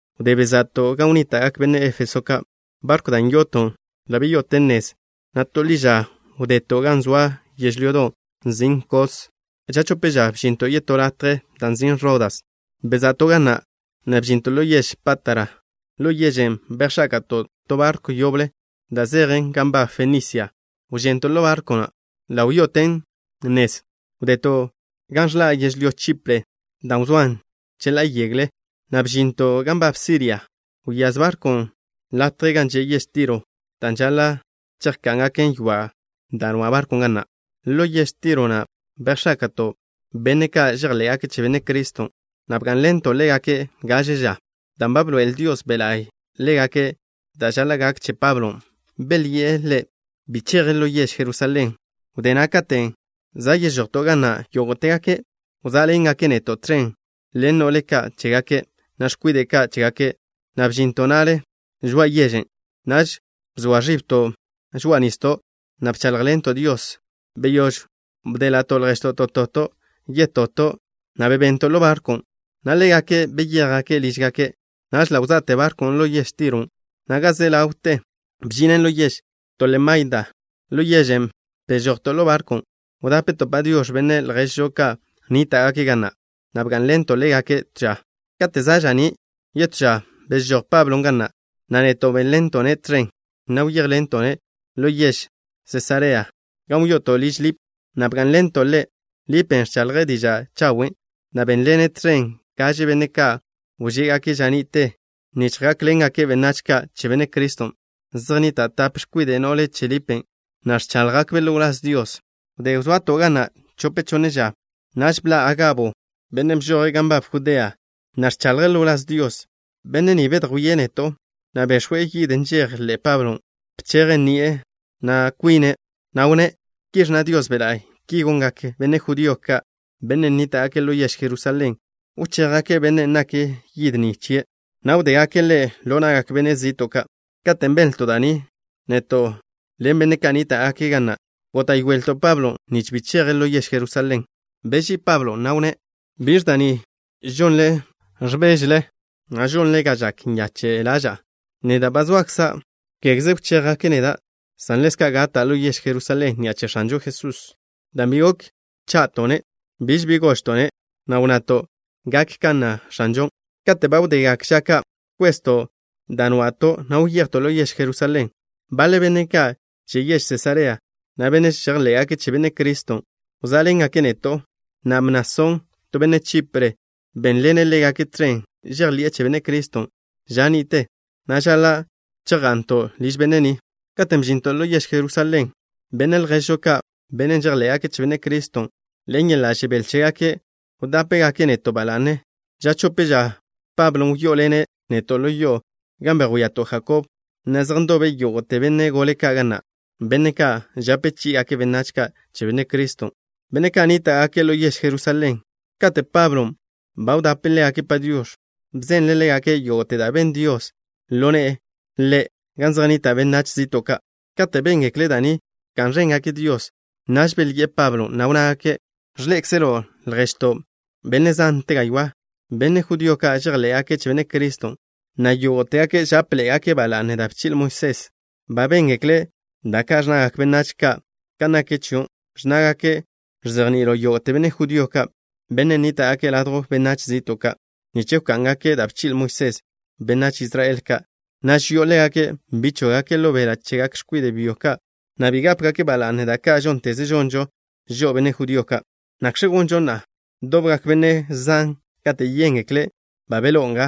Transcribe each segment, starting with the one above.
Wdé beza'to' gan wnníta'gak benne' Éfeso ka', barkw da' yo'oto' ḻa' wyo'oten nez, na' to ḻiža wdeto' gan zoa yežlyodon' nzin' Kos. Ža chope ža, bžinto' yetó latje da' nzin' Rodas. Beza'to' ga na', na' bžinto' ḻo yež Pátara. Ḻo yežen' bejx̱áka'to' to barkw yoble da' zejen gan nbab Fenisia. Wžento' ḻo barkwn', na' ḻa' wyo'oten nez. Wdeto' gan ẕḻa' yežlyó Chipre, da' wzóan cheḻá'a yegle, na' bžinto' gan nbab Siria. Wyáz barkwn' latjen' gan že' yež Tiro, dan' žaḻa' chejká'ngake' ywa' da' nwa' barkwn' ga na'. Ḻo yež Tiro na' bejx̱áka'to' benne' ka' žejḻé'gake' che Benne' Criston', na' bgá'nḻento' ḻégake' gaže ža. Dan' ba bḻoe'el Dios Be' La'y ḻégake' da' žaḻa' gak che Pablon', belyi'e ḻe' bi cheje' ḻo yež Jerusalén. Wdé na' katen' za' yežojto' ga na', yógo'tegake' wzá'ḻengake' neto' tẕen ḻen no'le ka' chégake', na' x̱kwide' ka' chégake', na' bžinto' na'le žoa'a yežen'. Naž bzoa ẕibto' žoa'a nisdo', na' bcháḻjḻento' Dios. Beyóž wdéḻa'to' lježto' toto' yetoto', na' bebento' ḻo barkwn', na' ḻégake' beyéjgake' lížgake'. Naž ḻa' wza'te barkwn' ḻo yež Tiron', na' ga ze ḻawte bžinen ḻo yež Tolemaida. Ḻo yežen' bežojto' ḻo barkwn'. Wdapto' “Padiox̱” benne' lježžo ka' nníta'gake' ga na', na' bgá'nḻento' ḻégake' to ža. Kate' za' ža'ní' yetó ža, bežój Pablon' ga na', na' neto' bénḻento'-ne' tẕen, na' wyejto' ḻo yež Sesarea, gan wyo'oto' liž Lip, na' bgá'nḻento' ḻe'. Lipen' ẕchaḻje' diža' chawen', na' bénḻene' tẕen gaže benne' ka' wžégake' ža ni'te nich gákḻengake' benách ka' che Benne' Criston'. Zej nnita' tape x̱kwide' no'le che Lipen', na' ẕcháḻjgakbe' ḻo wláz Dios. Wdé wzoato' ga na' chope chonne ža, naž bḻa' Agabo, benne' bžoje' gan nbab Judea, na' ẕchaḻje' ḻo wláz Dios. Benne' ni bedjwíe' neto', na' bex̱we' yid nžejen ḻe'e Pablon'. Bcheje' ni'a na' kwine', na' wnné': —Ki ẕnna Dios Be' La'y: “Ki gongak benne' judío ka', benne' nníta'gake' ḻo yež Jerusalén. Wchéjgake' bennen' nak yid ni chie', na' wdégake' ḻe' ḻo na'gak benne' zi'to' ka'.” Kate' benlto' da' ni, neto' ḻen benne' ka' nníta'gake' ga na' góta'yoelto' Pablon' nich bi cheje' ḻo yež Jerusalén. Beží'i Pablon', na' wnné': —¿Biẕ da' ni žonle, ẕbéžele, na' žonle ga žak nyache' ḻaža'a? Neda' ba zoakza', kégeze wchéjgake' neda', san ḻezka' gata' ḻo yež Jerusalén ni'a che X̱anžo Jesús. Dan' bi gok wcha'to'-ne', biž bi gožto'-ne', na' wnnato': —Gak kan nna X̱anžon'. Kate' ba wdegak ža ka', bkwezto' dan' nwa'to', na' wyejto' ḻo yež Jerusalén. Baḻe benne' ka' che yež Sesarea na', benne' žejḻé'gake' che Benne' Criston', wzá'ḻengake' neto', na' Mnasón, to benne' Chipre, bénḻene' ḻégake' tẕen. Žejḻi'e che Benne' Criston' ža ni'te, na' žaḻa' chejga'nto' liž benne' ni. Katen' bžinto' ḻo yež Jerusalén, benne' lježžo ka', benne' žejḻé'gake' che Benne' Criston', ḻen yeḻa' žebél chégake' wdápegake' neto' ba la'ne. Ža chope ža, Pablo wyó'oḻene' neto' ḻo yo'o, gan bejwíato' Jakob, na' zej ndobe yógo'te benne' gole ka' ga na', benne' ka' žape chí'igake' benách ka' che Benne' Criston', benne' ka' nníta'gake' ḻo yež Jerusalén. Kate' Pablon' ba wdape' ḻégake' “Padiox̱” bzenle' ḻégake' yógo'te da' ben Dios ḻo ne'e ḻe' gan zej nnita' benách zi'to' ka'. Kate' béngekle' da' ni, bka'n ẕéngake' Dios. Naž belyi'e Pablon', na' wnnágake': —Ẕḻé'ekzelo', lježto', benne' zante gaywá', benne' judío ka', žejḻé'gake' che Benne' Criston', na' yógo'tegake' žápeḻe'egake' ba la'ne da' bchi'le Moisés. Ba béngekle' da' ka' ẕnnagak benách ka' kan naken chio', ẕnnágake' ẕzejni'ilo' yógo'te benne' judío ka', benne' nníta'gake' ladjw benách zi'to' ka', nich wká'ngake' da' bchi'le Moisés benách Israel ka', na' ži'o ḻégake' bi chóggake' ḻo beḻa' chegak x̱kwide' byo chégake' ka', na' bi gápegake' ba la'ne da' ka' žónteze žonžo žo'o, benne' judío ka'. ¿Nakx̱ gonžo na'a? Dobgak benne' zan kate' yéngekle' ba beḻó'o nga.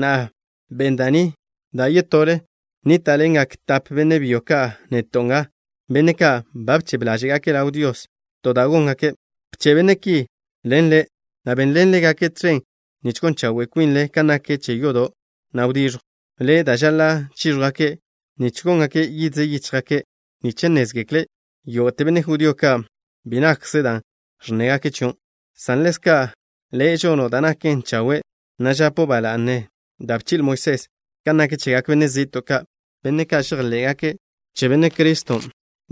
Na'a, ben da' ni da' ye'to' le'. Nníta'ḻengak tape benne' byo ka' neto' nga, benne' ka' ba bchebe ḻáže'gake' ḻaw Dios to da' góngake'. Bche' benne' ki ḻen le', na' benḻen ḻégake' tẕen nich gon chawe' kwinle kan nak che yodo', na' wdiẕjw le' da' žaḻa' chíẕjwgake' nich góngake' yidze yíchjgake', nich nnézgekle yógo'te benne' judío ka' bi nakkze dan' ẕnnégake' chio', san ḻezka' le' žono' da' naken chawe', na' žapo' ba la'ne da' bchi'le Moisés. Kan nak chegak benách zi'to' ka', benne' ka' žejḻé'gake' che Benne' Criston',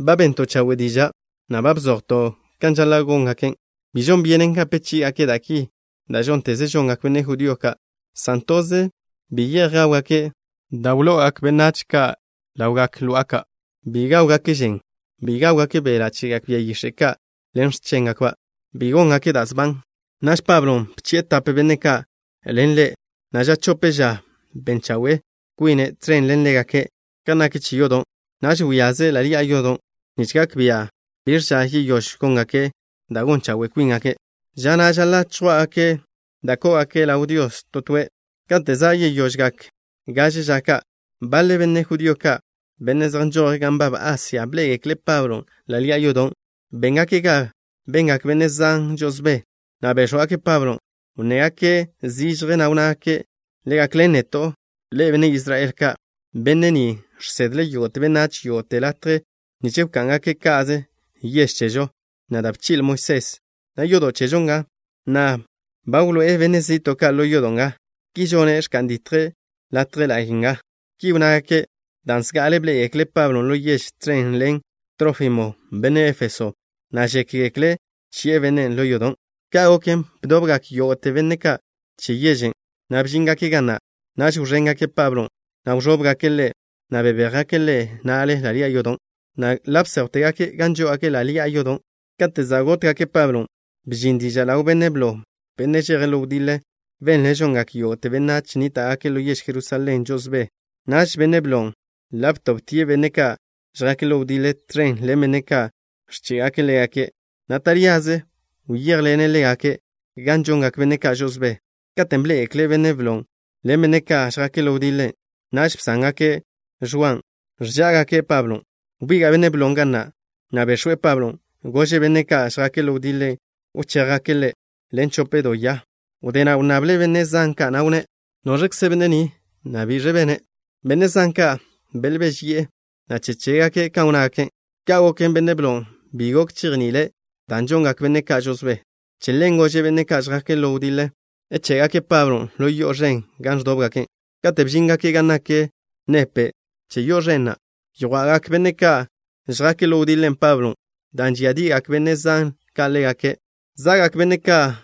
ba bento' chawe' diža', na' ba bzojto' kan žaḻa' góngake'. Bi žon byenen gape chí'igake' da' ki da' žónteze žongak benne' judío ka', san toze: Bi ye'j gáwgake' da' wlo'ogak benách ka' ḻawgak lo'a ka'. Bi gáwgake' žen. Bi gáwgake' beḻa' chegak bia yix̱e' ka' ḻen x̱chéngakba'. Bi góngake' da' sban. Naž Pablo bchi'e tape benne' ka' ḻen ḻe', na' ža chope ža ben chawe' kwine' tẕen ḻen ḻégake' kan nak che yodo'. Naž wyaze' ḻa' ḻi'a yodo', nich gak bia' biẕ ža yeyóž góngake' da' gon chawe' kwíngake', ža na' žaḻa' chjwá'gake' da' kó'ogake' ḻaw Dios to toe'. Kate' za' yeyožgak gaže ža ka', baḻe benne' judío ka', benne' zej nžoje' gan nbab Asia, bḻé'egekle' Pablon' ḻa' ḻi'a yodo'. Béngake' ga bengak benne' zan žo'osbé, na' béx̱wgake' Pablon'. Wnnégake' zižje, na' wnnágake': —Le gakḻen neto', ḻe'e, benne' Israel ka'. Benne' ni žsedle' yógo'te benách yógo'te latje nich wká'ngake' ka'ze yež chežo, na' da' bchi'le Moisés, na' yodo' chežo nga. Na'a, ba wḻoé'e benne' zi'to' ka' ḻo yodo' nga. Ki žone', ẕka'n ditjle' latje la'y nga. Ki wnnágake' dan' zga'ale bḻé'egekle' Pablon' ḻo yež tẕen ḻen Trófimo, benne' Éfeso, na' žékgekle' bchi'e bennen' ḻo yodon'. Ka' goken, bdobgak yógo'te benne' ka' che yežen', na' bžíngake' ga na'. Naž wẕéngake' Pablon', na' wẕóbgake' ḻe', na' bebéjgake' ḻe' na'le ḻa' ḻi'a yodon', na' ḻa' bséjwtegake' gan žó'ogake' ḻa' ḻi'a yodon'. Kate' za' gótgake' Pablon', bžin diža' ḻaw benne' blo, benne' žeje' ḻo wdiḻe. Benle' žongak yógo'te benách nníta'gake' ḻo yež Jerusalén žo'osbé. Naž benne' blon' ḻa' btobtie' benne' ka' žjake' ḻo wdiḻe, tẕen ḻen benne' ka' ẕché'gake' ḻégake', na' taríaze wyéjḻene' ḻégake' gan žongak benne' ka' žo'osbé. Katen' bḻé'egekle' benne' blon' ḻen benne' ka' žjake' ḻo wdiḻe, naž bsángake' ẕwaw ẕžá'agake' Pablon'. Wbiga' benne' blon' ga na', na' bex̱we' Pablon'. Gože' benne' ka' žjake' ḻo wdiḻe wchéjgake' ḻe' ḻen chope do ya. Wdé na' wnnable' benne' zan ka', na' wnné': —¿Noẕkze benne' ni, na' biẕ bene'? Benne' zan ka' belbéžeyi'e, na' che chégake' kan wnnágake'. Ka' goken, benne' blon' bi be gok chejni'ile', dan' žongak benne' ka' žo'osbé. Che ḻen gože' benne' ka' žjake' ḻo wdiḻe ché'gake' Pablon' ḻo yo'o ẕen gan ẕdóbgake'. Katen' bžíngake' gan nak nepe' che yo'o ẕen na', yjwa'gak benne' ka' žjake' ḻo wdiḻe Pablon', dan' žíadi'igak benne' zan ka' ḻégake'. Za'gak benne' ka'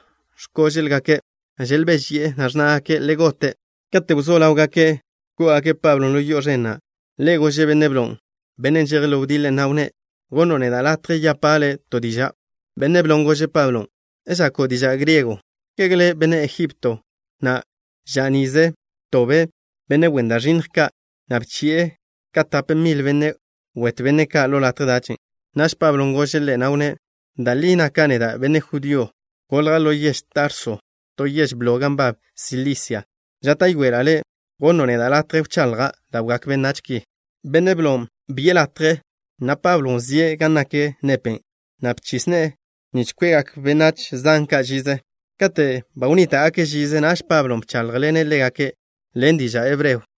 x̱kóže'lgake'. Želbéžeyi'e, na' ẕnnágake': —¡Le gote'! Kate' wzó ḻáwgake' kó'ogake' Pablo ḻo yo'o ẕen na', ḻe' gože' benne' blon', bennen' žeje' ḻo wdiḻe, na' wnné': —¿Gonno' neda' latje yapa' le' to diža'? Benne' blon' gože' Pablon': —¿Žako' diža' griego? ¿Kege le' benne' Ejipto na' ža nize btobe' benne' wen da' ẕinnj ka', na' bchi'e ka tape mil benne' wetw benne' ka' ḻo latje dach? Naž Pablon' gože' ḻe', na' wnné': —Da' li naka' neda' benne' judío. Golja' ḻo yež Tarso, to yež blo gan nbab Silisia. Žáta'yoela' le' gonno' neda' latje wchaḻja' ḻawgak benách ki. Benne' blon' bi'e ḻe' latje, na' Pablon' wzíe' gan nak nepe', na' bchis ne'e nich kwe'gak benách zan ka' žize. Kate' ba wnníta'gake' žize, naž Pablon' bcháḻjḻene' ḻégake' ḻen diža' hebreo.